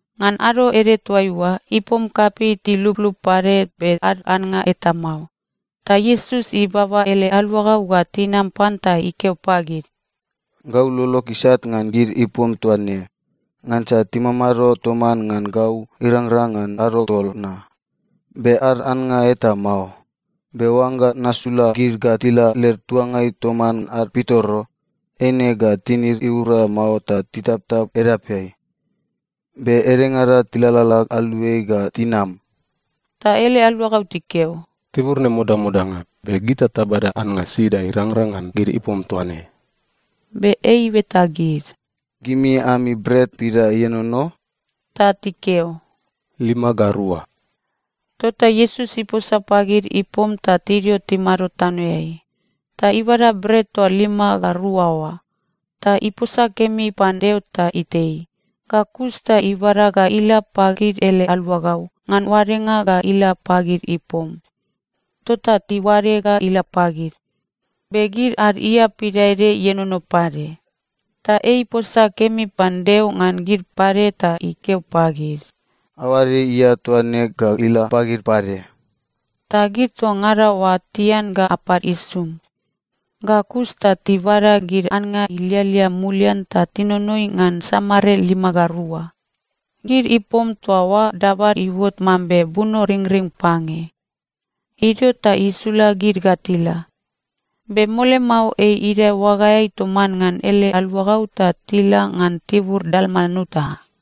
Ngan ado ede toaiua, ipom kapei tiluplup pade be ad annga eta mao. Ta Iesus ibaba ele aluagau ga tinam pan ta ikeo pagid, “Gau lolog isat ngan gid ipom toa ne, ngansa timamado toman ngan gau irangrang ngan ado tol na, be ad annga eta mao. Be oangga nasula gid ga tila led tuangai toman ad pitoro, eine ga tinid iura mao ta titaptap edapeai. Be edengada tilalala aluai ga tinam.” Ta ele aluagau tikeo, “Tibur ne modamodanga. Be gita tabada annga sida irangrang ngan gid ipom toa ne?” Be ei ibeta gid, “Gimi ami bret pida ienono?” Ta tikeo, “Lima ga rua.” Tota Iesus iposa pagid ipom ta tidio timado tanoeai. Ta ibada bret toa lima ga rua oa, ta iposa kemi pan Deo ta itei. Ga kus ta ibada ga ila pagid ele aluagau ngan oadenga ga ila pagid ipom. Tota tiuade ga ila pagid. Be gid ad ia pidaede ienono pade, ta ei iposa kemi pan Deo ngan gid pade ta ikeo pagid, “Aoade ia toa ne ga ila pagid pade.” Ta gid toa ngada oa tian ga apad isum. Ga kus ta tibada gid annga ilialia mulian ta tinonoi ngan samare lima ga rua. Gid ipom toa oa dabad iuot mambe bunoringring pange. Idio ta isula gid ga tila. Be mole mao, ei idae oagaeai toman ngan ele aluagau ta tila ngan tibur Dalmanuta.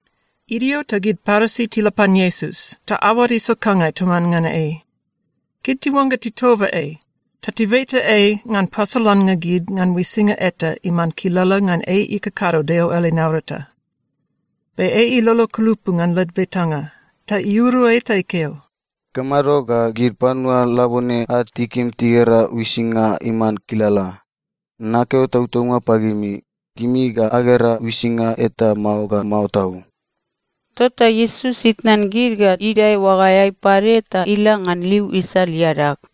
Idio ta gid Parisi tila pan Iesus ta aoad isokangai toman ngan ei. Gid tiuangga titoba ei ta tibeta ei ngan pasolannga gid ngan uisinga eta iman kilala ngan ei ikakado Deo ele naurata. Be ei ilolo kulupu ngan led betanga, ta iuru ei ta ikeo, “Ikamado ga gid panua labone ad tikim tigera uisinga iman kilala? Nakeo tautaunga pagimi, gimi ga agera uisinga eta mao ga mao tau.” Tota Iesus itnan gid ga idae oagaeai pade ta ila ngan liu isal iadag.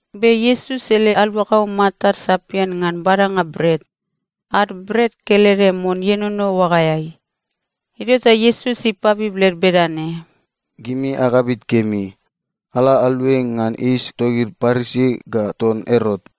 Be Iesus ele aluagau matad sapian ngan badanga bret. Ad bret kelede mon ienono oagaeai. Idio ta Iesus ipabib led bedane, “Gimi agabit kemi. Ala aluai ngan yis togid Parisi ga ton Erot.”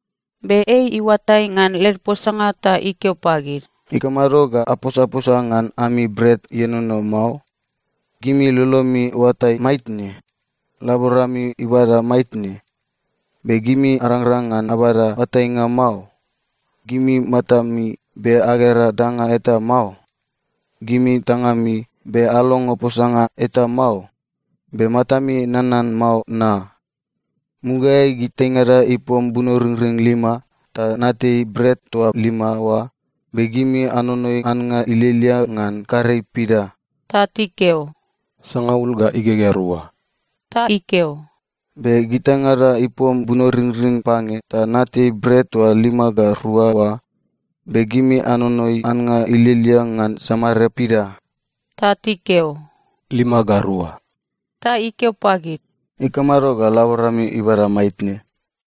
Be ei iuatai ngan led posanga ta ikeo pagid, “Ikamado ga aposaposa ngan ami bret ienono mao? Gimi lolomi iuatai maitne? Laborami ibada maitne? Be gimi arangrang ngan abada oatainga mao? Gimi matami, be agera danga eta mao? Gimi tangami, be alongo posanga eta mao? Be matami nanan mao na? Mugaeai gitaingada ipom bunoringring lima, ta natei bret toa lima oa, be gimi anonoi annga ilialia ngan karei pida?” Ta tikeo, “Sangaul ga igegea rua.” Ta ikeo, “Be gitaingada ipom bunoringring pange, ta natei bret toa lima ga rua oa, be gimi anonoi annga ilialia ngan samare pida?” Ta tikeo, “Lima ga rua.” Ta ikeo pagid, “Ikamado ga laborami ibada maitne?”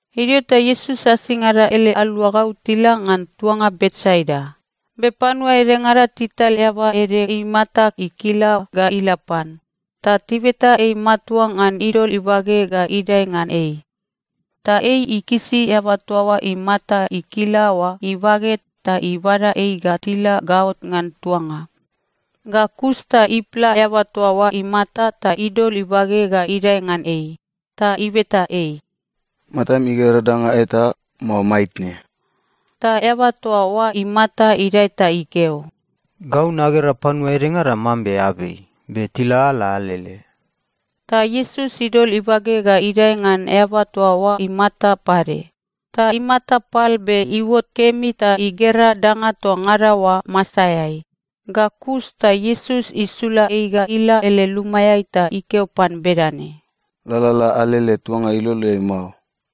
Idio ta Iesus asingada ele aluagau tila ngan tuanga Betsaida. Be panua edengada tital eaba ede imata ikila ga ila pan. Ta tibeta ei matua ngan idol ibage ga idae ngan ei. Ta ei ikisi eaba toa imata ikila oa ibage ta ibada ei ga tila gaot ngan tuanga. Ga kus ta ipla eaba toa oa imata ta idol ibage ga idae ngan ei. Ta ibeta ei, “Matam igera danga eta, mao maitne?” Ta eaba toa oa imata idae ta ikeo, “Gau nagera panua edengada mambe abei, be tilalala alele.” Ta Iesus idol ibage ga idae ngan eaba toa oa imata pade, ta imata pal be iuot kemi ta igera danga toa ngada oa masaeai. Ga kus ta Iesus isula ei ga ila ele lumaeai ta ikeo pan bedane, “Lalala alele tuanga iloleai mao.”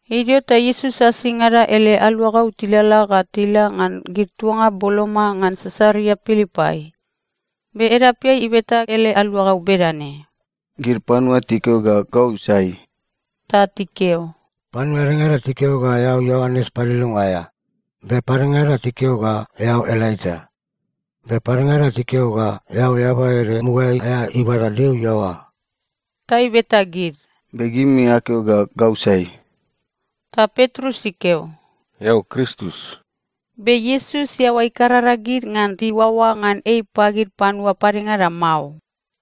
Idio ta Iesus asingada ele aluagau tilalala ga tila ngan gid tuanga boloma ngan Sisaria Pilipai. Be edapeai ibeta ele aluagau bedane, “Gid panua tikeo ga gau sai?” Ta tikeo, “Panua edengada tikeo ga eao Ioanes Paliliunga aea, be padengada tikeo ga eao Elaija, be padengada tikeo ga eao eaba ede mugaeai aea ibada Deo iaoa.” Ta ibeta gid, “Be gimi akeo ga gau sai?” Ta Petrus ikeo, “Eao Kristus.” Be Iesus iaoa ikarara gid ngan tiuaoa ngan ei pagid panua padengada mao.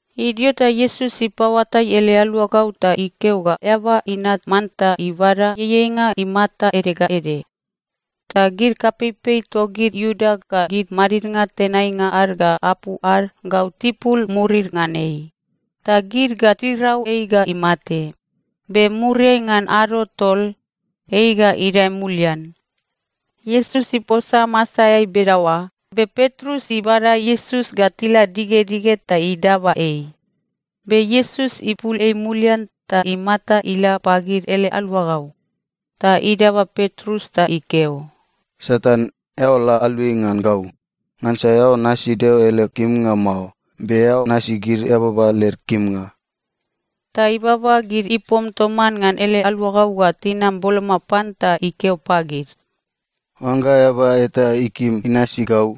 Idio ta Iesus ipaoatai ele aluagau ta ikeo ga Eaba Inat manta ibada ieieinga imata ede ga ede. Ta gid kapeipei togid Iuda ga gid madidnga tenainga ad ga apu ad gau tipul murid ngan ei. Ta gid ga tirau ei ga imate. Be muriai ngan ado tol, ei ga idae mulian. Iesus iposa masaeai bedaoa, be Petrus ibada Iesus ga tila digedige ta idaba ei. Be Iesus ipul ei mulian ta imata ila pagid ele aluagau, ta idaba Petrus ta ikeo, “Satan, eao la aluai ngan gau! Ngansa eao nasi Deo ele kimnga mao, be eao nasi gid eababa led kimnga.” Ta ibaba gid ipom toman ngan ele aluagau ga tinam boloma pan ta ikeo pagid, “Oangga eaba eta ikim inasi gau,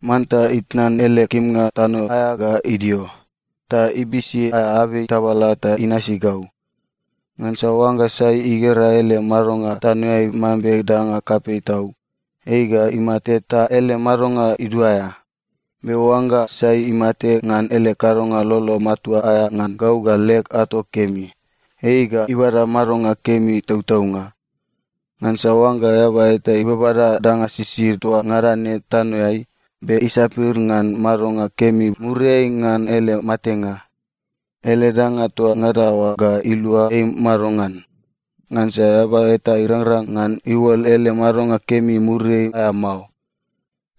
manta itnan ele kimnga tano aea ga idio, ta ibisi aea abei tabala ta inasi gau. Ngansa oangga sai igera ele madonga tanoeai mambe danga kapei tau, ei ga imate ta ele madonga iduaea. Be oangga sai imate ngan ele kadonga lolo matua aea ngan gau ga leg ato kemi, ei ga ibada madonga kemi tautaunga. Ngansa oangga eaba eta ibabada danga sisid toa ngada ne tanoeai, be isapir ngan madonga kemi muriai ngan ele matenga, ele danga toa ngada oa ga ilua ei madongan? Ngansa eaba eta irangrang ngan iuol ele madonga kemi muriai aea mao.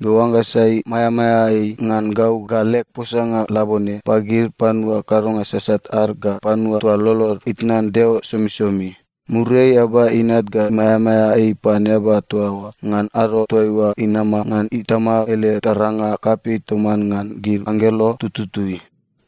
Be oangga sai maeamaea ei ngan gau ga leg posanga labone, pagid panua kadonga sasat ad ga panua toa lolod itnan Deo somisomi, muriai Eaba Inat ga maeamaea ei pan eaba toa oa ngan ado toaiua inama ngan Itama ele taranga kapei toman ngan gid anggelo tututui.”